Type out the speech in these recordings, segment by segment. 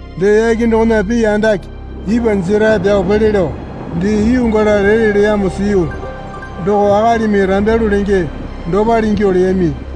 Dee yake dokona pii andake ipwa jerae pyao pele lao dee yuu gala lele leyamo siyu. Doko akalimi rambyalu lenge dopale ingyuo leyami.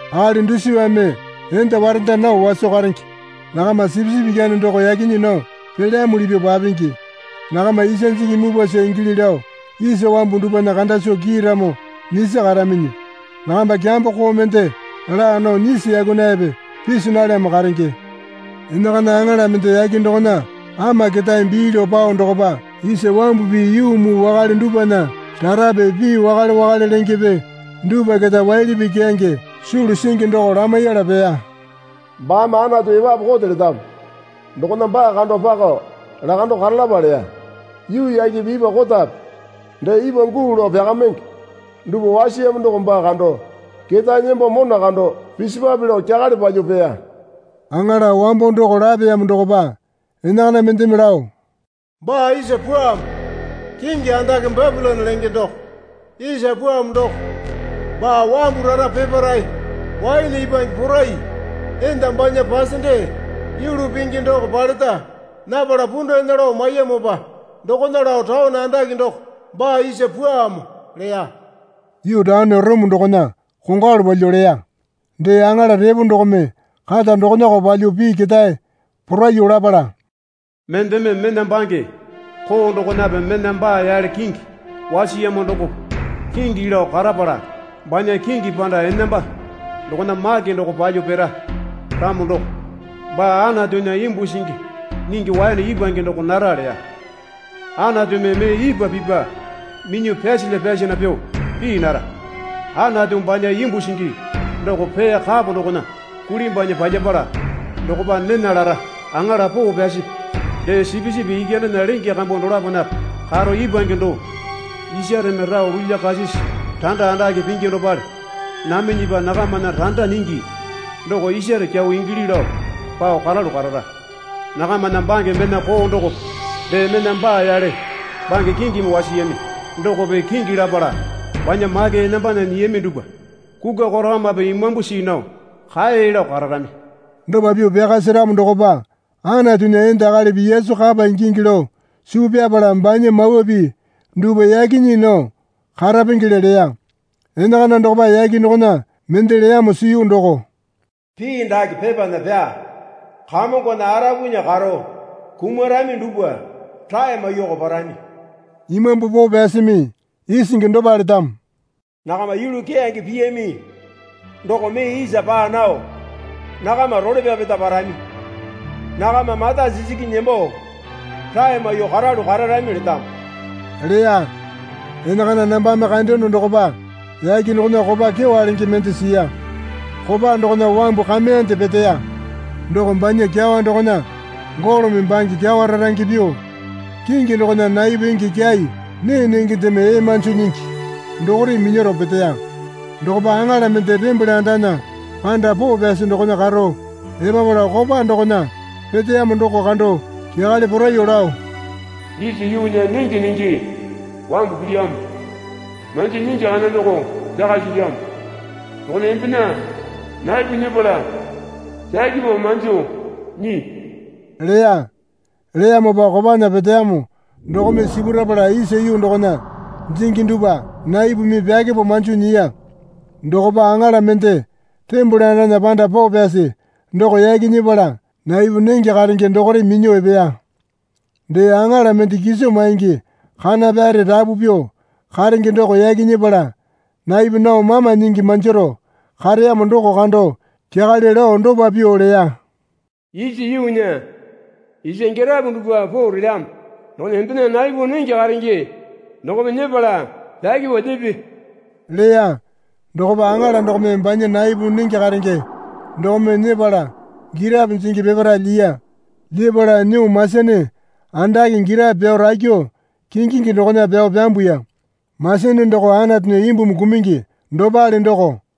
Akali dusipame enda warenda nao waso karenge. Nakama Sipisipi Ikyane doko yaki nyii nao pelyamuli pyuo papingi. Nakama isa jingi mupwasa ingili lao isa wambu dupwana kanda soo kiiramo nyisi karaminyi. Nakamba kyambo koo mende laa nao nyisu yakunayape pisi nalyamo karenge. Enakana aŋala mende yake dokona ama ketae bii lao pao dokopa isa wambupi yuu muu wakale dupwana rarape pii wakale wakale lengepe dupwa keta waili pii keyange sulu singi doko lamaiyala peya. Baame Anatu epapu kote letamo dokona baa kando pakao lakandao karalapa leya. Yuu yakepe ipwa kotape dee ipwa guu lao pyakamenge dupwa wasiyamo doko baa kando ketae nembo mona kando pisipwape lao kyakale palyuo peya. Aŋala wambo doko lapeyamo dokopa enakana mendeme lao. Baa isa pwuamo. Kingi andake Bapilone lenge doko isa pwuamo doko baa wambu rara peparae waene ipwange porai enda banya pasende yulu pingi doko paleta napala pundana lao maiyamopa dokona lao taone andake doko baa isa pwuamo leya. (Yuu taone Orome dokona kongwalu palyuo leya.) Dee aŋala epo dokome kata dokonako palyuo pii ketae poraiyuo lapala, Mendeme mena bange koo dokonape mena baa yale kingi wasiyamo dokope kingi lao karapala banya kingi panda enamba dokona make doko palyuo pira ramo doko baa Anatunya imbu singi nyingi waene ipwange doko nara leya. Anatumi mee ipwa pipa minyuo pyasalya pyasana pyuo pii nara. Anatu banya imbu singi doko pee kapo dokona kulimbwanyi palyapala dokopa nena lara. Aŋala poo pyasipi dee Sipisipi Ikyanena lenge kambu dolaponape karo ipwange doo isareme rao lulyakasisi randa andake pingi dopale naminyipa nakamana randa nyingi doko isare kyau ingili lao pao karalu karara. Nakamana bange mena koo dokope dee mena baa yale bange kingimi wasiyami dokope kingi lapala banya make enambana nyiyami dupwa kukwa korakamape imambu see nao kae lao kararami. Dopa pyuo pyaka seramo dokopa Anatunya enda akalipi Yesu kapa ingingi lao suu pyapala banya mawa pii dupwa yaki nyii nao karapengele leya. Enakana dokopa yake dokona mende leyamo siyu doko, Pii dake pepana pyaa. Kamongona arapunya karo kumarami dupwa rae maiyuoko parami. Imambu Poo Pyasimi isingi dopa letamo. Nakama yulu keyange piyami doko mee isa paa nao nakama role pyapeta parami. Nakama mata sisiki nembo rae maiyuo karalu kararami letamo leya. Enakana nambame kandeyono dokopa yake dokona kopa kyewa lenge mende siya. Kopa dokona wambu kameyande peteya. Doko banya kyawa dokona golome bange kyawa rarange pyuo kingi dokona naipu enge kyai nee nengendeme ee manjo nyingi dokore minyaro peteya. Dokopa aŋala mende tembole andana panda poo pyasi dokona karo epapala kopa dokona peteyamo doko kando kyakale poraiyuo lao, Isa yuunya nenge nenge wambu pilyamo. Manjo nyingi kana doko pyaka silyamo dokona embena naipu nyepala pyakepo manjo nyii leya. Leyamopa kopana peteyamo dokome sipurapala isa yuu dokona jingi dupwa naipumi pyakepo manjo nyiya. Dokopa aŋala mende tembole andana panda poo pyasi doko yaki nyepala naipu nenge karenge dokore minyuo epeya. Dee aŋala mende kiso maingi kana pyare rapu pyuo karenge doko yaki nyepala naipu nao mama nyingi manjaro kareyamo doko kando kyakale lao dopa pyuo leya. Isa yuunya isa girapo dupwa poo relyamo dokona embena naipu nenge karenge dokome nyepala pyakepo lyepe leya. Dokopa aŋala dokome banya naipu nenge karenge dokome nyepala girapo jingi peparae lyiya. Lyepala nyuo masene andake girapo pyao rakyuo kingingi dokona pyao pyambuya. Masene doko Anatunya imbumi kumungi dopale doko.